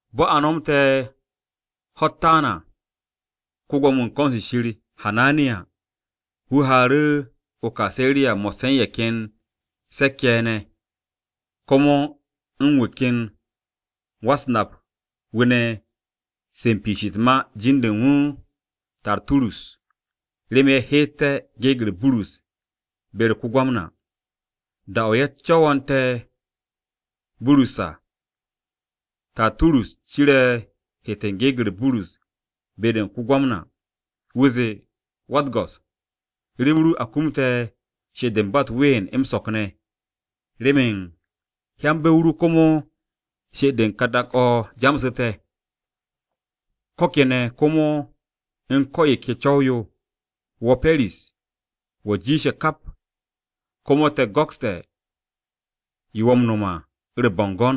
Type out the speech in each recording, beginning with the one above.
Bo̱ a nomte̱ ho̱-u̱t taan à, ko-Gwo̱mo-wu̱ u̱n ko̱n-se Shir, Hananiya, wu̱ haaru̱ o-Kaseriya mo̱sse̱ u̱n ye̱ ken se̱k-ye̱ ye̱ ne̱, komo u̱n wu̱ ken wa-u̱s-nap-wu̱ ne̱ se u̱n piish u̱t-ma, jin-de u̱n wu̱ Tarturus, remen ye̱ heeté̱ gyekt-u̱s Burus be-u̱r ko-Gwamna. Da-o̱ a co̱wo̱nte̱ Burus à, Tarturus ciru̱ heet u̱n geeg-u̱r Burus be-de u̱n ko-Gwamna. Wu̱ zee, “Wa-u̱t-go̱s, rem ru a kumte̱ she'et-de ba u̱t-ween m-so̱k ne̱, remen hyanbe̱ o ru komo she'et-de u̱n ka dak-o̱ jamsu̱te̱. Ko̱ kene̱ komo u̱n ko̱ yo ke co̱w-yo, wo̱ Pe̱ris, wo̱ jiishe̱ kap, komo te̱ go̱kste̱ yo wo̱ m-no̱m à u̱r-bo̱ngo̱n.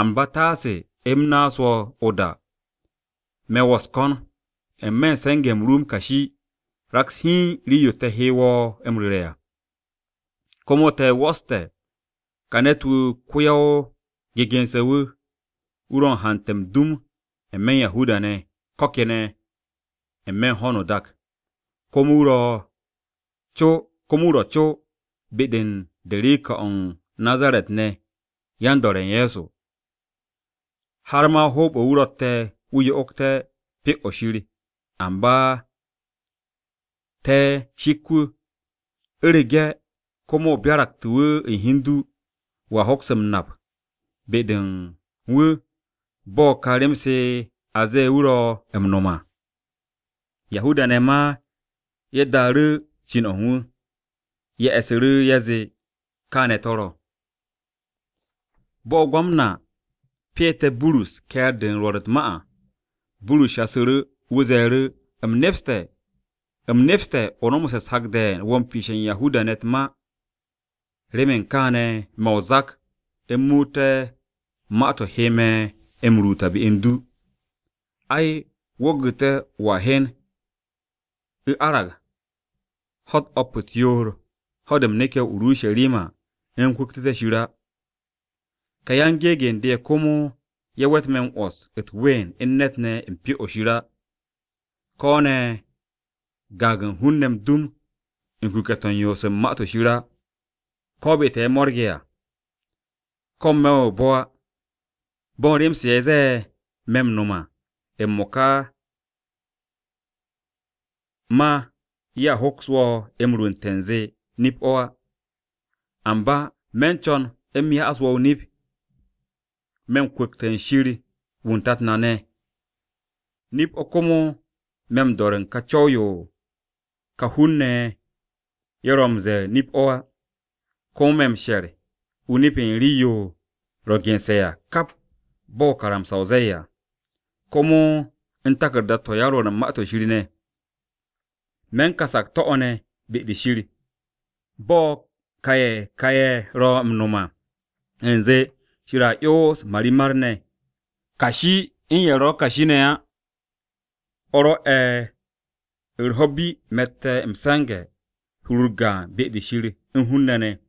Amba taase u̱m naas wo̱ o-da, me̱ wo̱ u̱s-ko̱n, n-me̱ u̱n se̱nge̱-m ru m-kashi raks hiin rii-yo te̱ he wo̱ m-ru̱re̱ à. “Komo te̱ 'wo̱ste̱ ka ne̱t-wu̱ ko-ya-o-a-gegense̱-wu̱. Wu̱ ro̱ u̱n haante̱ m-dum n-me̱ u̱n Yahuda-ne̱, ko̱ kene̱ n-me̱ u̱n ho̱no o-dak. Komo wu̱ ro̱ co be-de u̱n derika-o̱ u̱n Nazaret-ne̱ yan-do̱re̱ u̱n Ye̱so. Har ma hoob-o̱ wu̱ ro̱tte̱ wu̱ yo'ogte̱ Pyo-o̱ Shir, amba te̱ shik wu̱. U̱rege̱ komo o byaraktu̱ wu̱ u̱n hi u̱n du, wo̱a hoks m-nap be-de u̱n wu̱ bo̱ u̱n ka rem-se a ze̱e̱ wu̱ ro̱ m-no̱m à.” Yahuda-ne̱ ma ye̱ daaru̱ cin-o̱ u̱n wu̱. Ye̱ e̱su̱ru̱ ye̱ zee kaane̱ to̱ ro̱. Bo̱ ko-Gwamna pyeete̱ Burus ke̱e̱r-de u̱n rwo̱r u̱t-ma à, Burus shasu̱ru̱. Wu̱ ze̱e̱ru̱, “U̱m nepste̱ o nomoste̱ u̱s-hak de̱e̱n wo̱ m-piishe̱ u̱n Yahuda-ne̱ u̱t-ma. Remen kaane̱ me̱ o-zak u̱m muute̱ ma-to̱ he me̱ m-ruut à be u̱n du. Ai, wo̱ gu̱te̱ wo̱a hyen u̱ arag ho̱-u̱t o̱p u̱t-yoor ho̱-de u̱m neke̱ o-Urusharima u̱m kwu̱ktu̱té̱ Shir á. Ka yan-gyekt-u̱s re ye̱ komo ye̱ we̱t me̱ m-'wo̱s u̱t-ween u̱n ne̱t ne̱ u̱n Pyo-o̱ Shir á, ko̱ ne̱ gaag u̱n hun-ne̱ m-dum u̱n kuke̱-to̱ u̱n yoos u̱n Ma-to̱ Shir á, ko̱ be-to̱ ye̱ m-mo̱rge̱ à, ko̱ n-me̱ o-bo̱ á. Bo̱n rem-se ye̱ ze̱e̱ me̱ m-no̱m à m-mo̱ka ma ye̱a hoks wo̱ m-rwu̱nte̱ u̱nze nip-o̱ á. Amba, me̱ u̱n co̱n m-ru̱ru̱ wo̱ o-nip. Me̱ m-kwu̱kte̱ u̱n Shir wu̱ u̱n tat na ne̱. Nip-o̱ komo me̱ m-do̱re̱ u̱n ka Co̱w-yo yo ka hun-ne̱ ye̱ ro̱ m-ze̱e̱ nip-o̱ á. Komo me̱ m-she̱r o-nip u̱n rii-yo ro̱ gense̱ à kap bo̱ karamsa-o ze̱e̱ à, komo u̱n taku̱rda-to̱ yan-Rwo̱r u̱n Ma-to̱ Shir ne̱. Me̱ u̱n ka sakto̱-o̱ ne̱ be-de Shir, bo̱ ka ye̱ ka ye̱ ro̱ m-no̱m à, u̱nze, Shir a 'yons marimar-ne̱, kashi u̱n ye̱ ro̱ kashi ne̱ á. O̱ rwo̱'e̱ u̱r-ho̱ bi me̱tte̱ m-se̱nge̱ u̱n hur-u̱r gaan be-de u̱n Shir u̱n hun-ne̱ ne̱.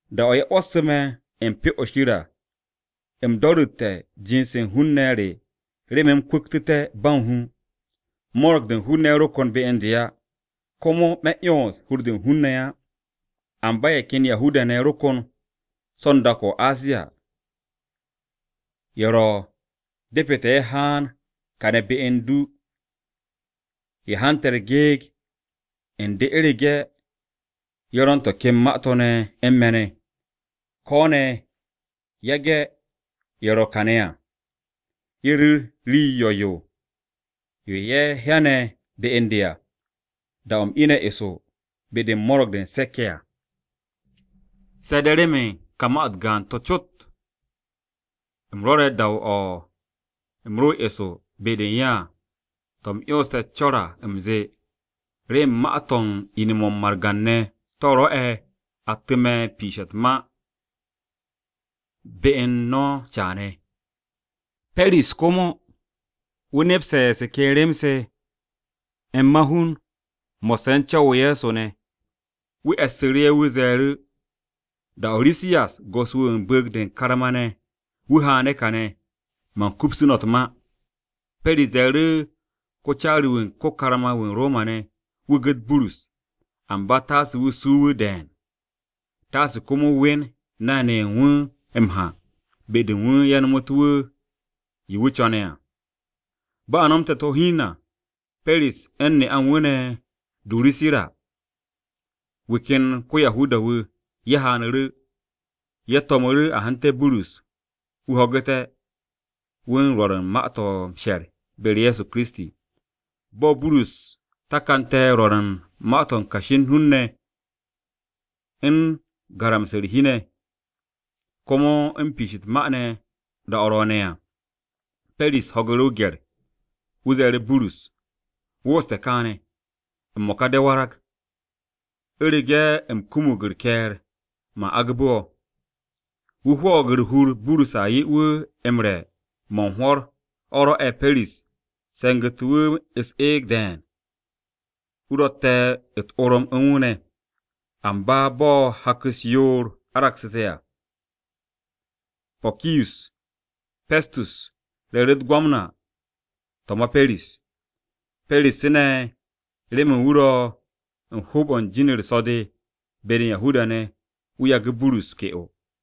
Da-o̱ ye̱ 'wo̱ssu̱ me̱ u̱n Pyo-o̱ Shir à, u̱m do̱ru̱tte̱ jind-se u̱n hun-ne̱ re remen u̱m kwu̱ktté̱ ba u̱n hu. Mo̱ro̱g-de u̱n hun-ne̱ ro kon be u̱n de á, komo me̱ 'yons hur-de u̱n hun-ne̱ á. Amba ye̱ ken Yahuda-ne̱ ro kon so̱ u̱n dak-o̱ o-Asiya, ye̱ ro̱ depete̱ ye̱ haan kàne̱ be u̱n du ye̱ hanté̱ gyekt-u̱s re u̱rege̱ ye̱ ro̱ u̱n to̱ ken ma-to̱ ne̱ u̱n me̱ ne̱. Ko̱ ne̱ yage̱ ye̱ ro̱ kàne̱ à, ye̱ ru̱r rii yo̱-yo yo ye̱ hyane̱ be u̱n de à, da-o̱ u̱m ine̱ eso be-de u̱n Mo̱ro̱g-de u̱n Se̱k-ye̱ à. Se̱ de̱ remen ka ma-to̱ u̱t-gaan cot to̱ u̱m rwo̱re̱ da-o̱ u̱m ro eso be-de u̱n ye̱ à, to̱ u̱m 'yonste̱ co̱r à u̱m zee, ‘Remen ma-to̱ u̱n ine̱-mo̱ u̱n margan-ne̱ to̱ rwo̱'e̱ attu̱ me̱ u̱n piishe̱ u̱t-ma be u̱n no̱ caane̱.’” Pe̱ris komo wu̱ nepste̱ se ken rem-se m-mahun mo̱sse̱ u̱n Co̱w-o Ye̱so ne̱. Wu̱ e̱ssu̱ru̱ ye̱, wu̱ ze̱e̱ru̱, “Da-o̱ Risiyas go̱s-wu̱ wu̱ u̱n bu̱u̱g-de u̱n karma-ne̱ wu̱ haane̱ kàne̱, man kupsu̱ no̱ u̱t-ma.” Pe̱ris ze̱e̱ru̱ ko-caari-wu̱ u̱n ko-karma-wu̱ u̱n Roma-ne̱, wu̱ gu̱t Burus, amba taase wu̱ suu wu̱ de̱e̱n, taase komo wu̱ we̱n nay-ne̱ ye̱ u̱n wu̱ m-ha be-de u̱n wu̱ ye̱ nomotu̱ wu̱ yo wu̱ co̱ne̱ à. Bo̱ a nomte̱ u̱t-ho̱ hiin à, Pe̱ris u̱n ne'a u̱n wu̱ ne̱ Durusira, wu̱ ken ko-Yahuda-wu̱ wu̱, ye̱ haanu̱ru̱. Wu̱ to̱mu̱ru̱ a hante̱ Burus, wu̱ ho̱gu̱té̱ wu̱ u̱n rwo̱r u̱n ma-to̱ m-she̱r be-u̱r Ye̱so Kiristi. Bo̱ Burus takante̱ rwo̱r u̱n ma-to̱ u̱n kashi u̱n hun-ne̱, u̱n garamse̱ u̱r-hi ne̱, komo u̱n piish u̱t-ma ne̱ da-o̱ ro̱o̱ne̱ à, Pe̱ris ho̱gu̱ru̱ o-gye̱r. Wu̱ ze̱e̱ru̱ Burus, “Wooste̱ kaane̱! M-mo̱ka de̱ warag. U̱rege̱ u̱m kumug u̱r-ke̱e̱r, man agbu̱ wo̱.” Wu̱ hwo̱o̱g u̱r-hur Burus a 'ye wu̱ m-re̱ mo̱ u̱n hwo̱r, o̱ rwo̱'e̱ Pe̱ris se̱ngu̱tu̱ wu̱ u̱s-eeg de̱e̱n, wu̱ rotte̱ u̱t-orom u̱n wu̱ ne̱. Amba bo̱ hak-u̱s yoor aragsu̱te̱ à, Pokiyus Pestus re̱e̱ru̱ u̱t-Gwamna to̱ ma Pe̱ris. Pe̱ris ne̱ remen wu̱ ro̱ u̱n hoob-o̱ u̱n jin-u̱r so̱-de be-de u̱n Yahuda-ne̱, wu̱ yagu̱ Burus ke'o.